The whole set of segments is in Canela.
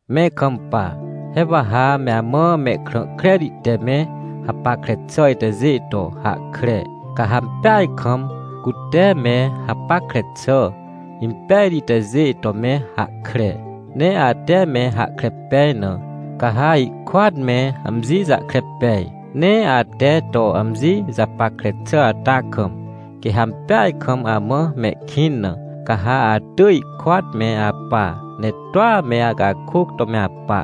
Me ikampa. He wa ha me amã mehkrã kreti te me hapackre xà itajê to hahkre. Ca ha ampeaj kam, cute me hapackre xà impejti itajê to me hahkre, ne ate me hahkre pej na, ca ha ihkôat me amji jahkre pej. Ne ate to amji japackre xà ata kam, quê ha ampeaj kam amã mehkĩn na, ca ha atỳj ihkôat me apa, ne toa me acakôc to me apa.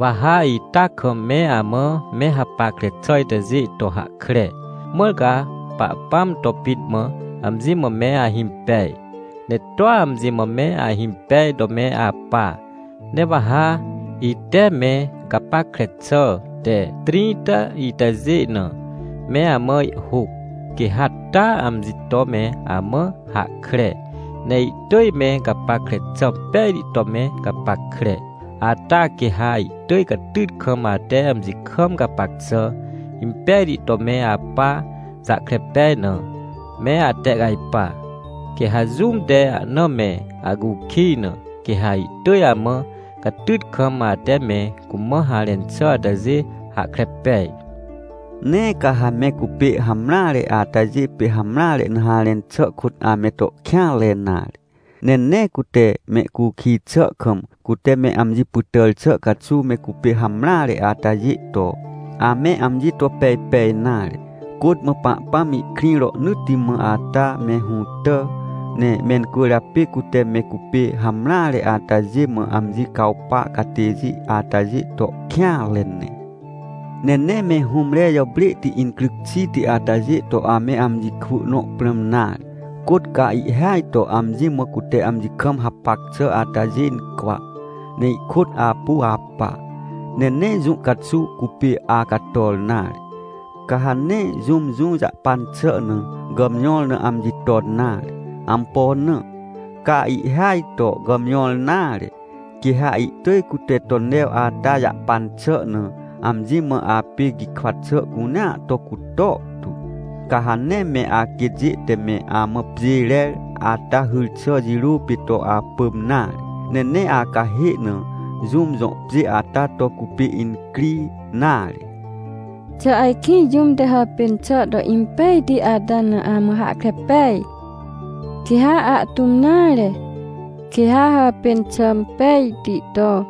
Wa ha ita kam me amã me hapackre xà itajê to hahkre, mãr ca Pahpãm to pit mã amji mã me ahimpej, ne toa amji mã me ahimpej to me apa. Ne wa ha, ite me gapackre xà te trĩnta itajê na, me amã ihhôc. Quê ha taa amji to me amã hahkre, ne ihtỳj me gapackre xà impejti to me gapackre. Ata quê ha ihtỳj catyt kam ate amji kam gapac xà impejti to me apa jahkre pej na, me atehcajpa. Quê ha jũm te ahna me acukij na, quê ha ihtỳj amã catyt kam, ate me cumã harẽn xà atajê hahkre pej. Nee ca ha me cupê hamreare atajê pê hamreare na harẽn xà kôt ame to kêanre nare. Ne nee cute mehcukij xà kam, cute me amji pytàr xà caxuw me cupê hamreare atajê to, ame amji to pejpej nare. Côt mã Pahpãm ihkrĩ rohnỳtti mã ata me hũtà, ne mencwỳrjapê cute me cupê hamreare atajê mã amji cawpa catêjê atajê to kêanre ne. Ne nee me hũmre jàprêhti incryc xiti atajê to ame amji kwỳ nõ prãm nare. Côt ca ihhêaj to amji mã cute amji kam hapac xà atajê incwa, ne ihkôt apu apa, ne nee jũ caxuw cupê acator nare. Ca ha nee jũm jũ jahpan xà na, gàmjõr na amji ton nare. Ampo na? Ca ihhêaj to gàmjõr nare, quê ha ihtỳj cute to new ata jahpan xà na, amji mã apê gikwa xà cunea to cutor tu. Ca ha nee me aquêtjê te me amã pjê rer ata hyr xà jirô pê to apỳm nare, ne nee acahê na jũm jõ pjê ata to cupê incri nare. Xà ajkĩ jũm te hàpên xà to impejti ata na amã hahkre pej? Quê ha ahtũm nare, quê ha hàpên xà impejti to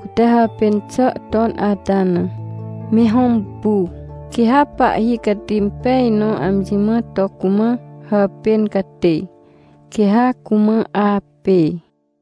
cute hàpên xà ton ata na, me hõmpu. Quê ha pahhi cati impej nõ amji mã to cumã hàpên catê, quê ha cumã apê.